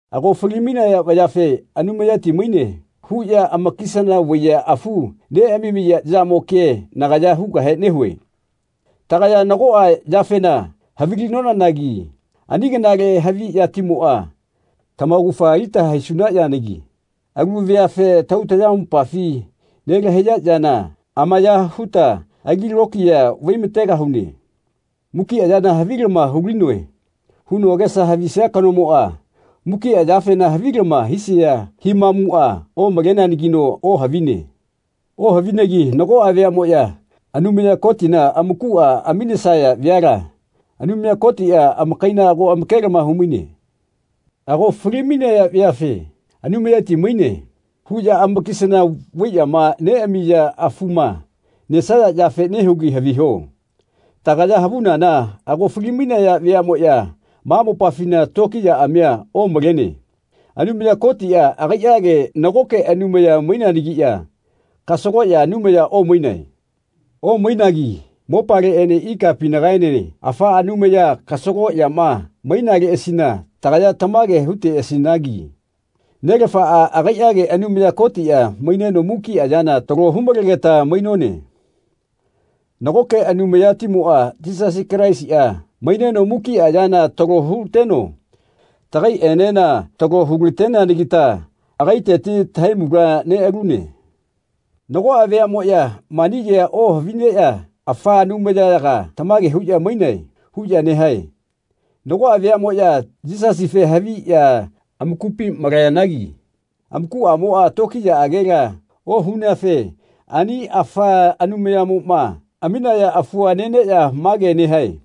Ago fali-mainaya vayafe “Anumayati maine.” huꞌya amakisana vaiꞌya afu neꞌamamiya yamo kea nagaya hugahe nehue. Tagaya nagoꞌa yafena havilinonanagi ani kanale haviꞌyatimoꞌa tamaugafa alita haisuna yanagi alu veafe tahau-tamayamopafi nelahaiya yana amaya huta ali tokiya vaimategahune. “Mukiꞌa yana havilama hulinoe.” huno agesa havisia kanomoꞌa mukiꞌa yafema havilama hisia himamuꞌa omaleneanagino ohavine. Ohavinegi nagoꞌa veaꞌmoꞌya Anumaya Kotina amakuꞌa aminesaya veala Anumaya Kotiꞌa amakaila ago amakelama humaine. Ago fali-mainaya veafe “Anumayati maine.” huꞌya amakisana vaiꞌyama neꞌamiya afuma nesaya yafe nehugi haviho. Tagaya havunana ago fali-mainaya veaꞌmoꞌya ma mopafina tokiyaꞌamia omalene. Anumaya Kotiꞌa agaiꞌage nagoke Anumaya maineanagiꞌya kasagoꞌya Anumaya omainae. Omainagi mopaleꞌene ikapinagaene afa anumaya kasagoꞌyama mainaleꞌasina tagaya tamage huteꞌasinagi “Nelafaꞌa agaiꞌage Anumaya Kotiꞌa maineno mukiꞌa yana talo humalegeta mainone. Nagoke Anumayatimoꞌa Yisasi Kalaisiꞌa maineno mukiꞌa yana talo huteno tagaiꞌenena talo hulateneanagita agaiteti tahaimula neꞌalune.” Nagoꞌa veaꞌmoꞌya mani kea ohavineꞌya “Afa anumayayaga tamage huꞌya mainae.” huꞌya nehae. Nagoꞌa veaꞌmoꞌya Yisasife haviꞌya amakupi malayanagi amakuꞌamoꞌa tokiyaꞌagela ohuneafe ani afa anumayamoma aminaya afua neneꞌya mage nehae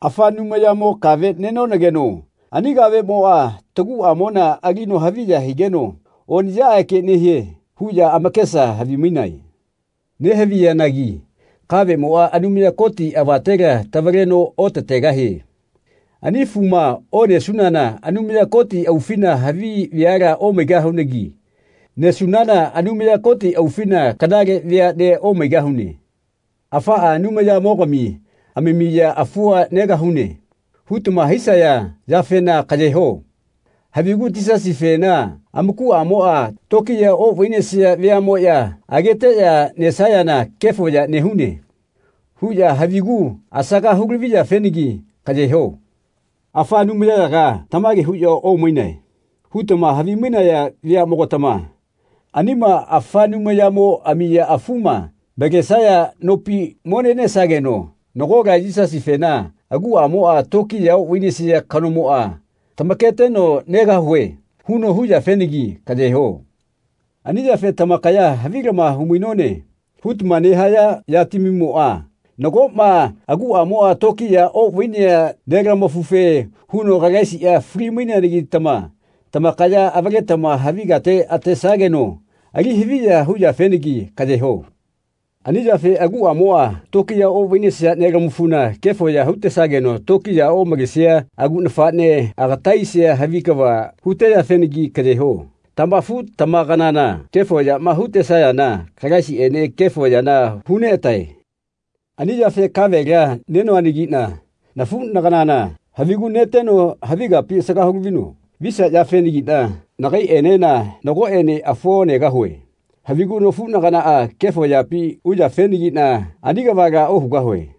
“Afa anumayamo kave nenonageno ani kaveꞌmoꞌa taguꞌamona alino haviya higeno oniꞌyaꞌage nehie.” huꞌya amakesa havimainae. Nehaviyanagi kaveꞌmoꞌa Anumaya Koti avatela tavaleno otategahie. Ani afuma onesunana Anumaya Koti aufina havi veala omaigahunagi nesunana Anumaya Koti aufina kanale veaꞌnea omaigahune. “Afaꞌa anumayamogami amamiya afua negahune.” hutama hisaya yafena kaꞌyeho. Havigu Yisasifena amakuꞌamoꞌa tokiya oꞌvainesia veaꞌmoꞌya ageteꞌya nesayana “Kefo ya nehune.” huꞌya havigu asaga hulaviyafenagi kaꞌyeho. “Afaꞌa anumayayaga tamage huꞌya omainae.” hutama havimainaya veaꞌmogatama anima afa anumayamo amiya afuma malenesaya nopi mo nenesageno nagola Yisasifena aguꞌamoꞌa tokiya oꞌvainesia kanomoꞌa tamaketeno “Negahue.” huno hu yafenagi kaꞌye ho. Ani yafe tamakaya “Havilama humainone.” hutama nehaya yatamimoꞌa, nagoꞌma aguꞌamoꞌa tokiya oꞌvainea nelamafufe huno Kalaisiꞌa fali-maineanagitama tamakaya avaletama havi kate atesageno ali haviya huyafenagi kaꞌye ho. Ani yafe aguꞌamoꞌa tokiya oꞌvainesia nelamafuna kefo ya hutesageno tokiyaꞌa omalesia agu nafaꞌnea agata aisia havi kava huteyafenagi kaꞌye ho. Tamafu-tamakanana kefo yaꞌma hutesayana Kalaisiꞌene kefo yana huneꞌatae. Ani yafe kavela nenoanagiꞌna nafuꞌnaganana havigu neteno havi kapi asaga hulavino visia yafenagiꞌna nagaiꞌenena nagoꞌene afua onegahue. Havigu nafuꞌnaganaꞌa kefo yapi uyafenagiꞌna ani kavala ohugahue.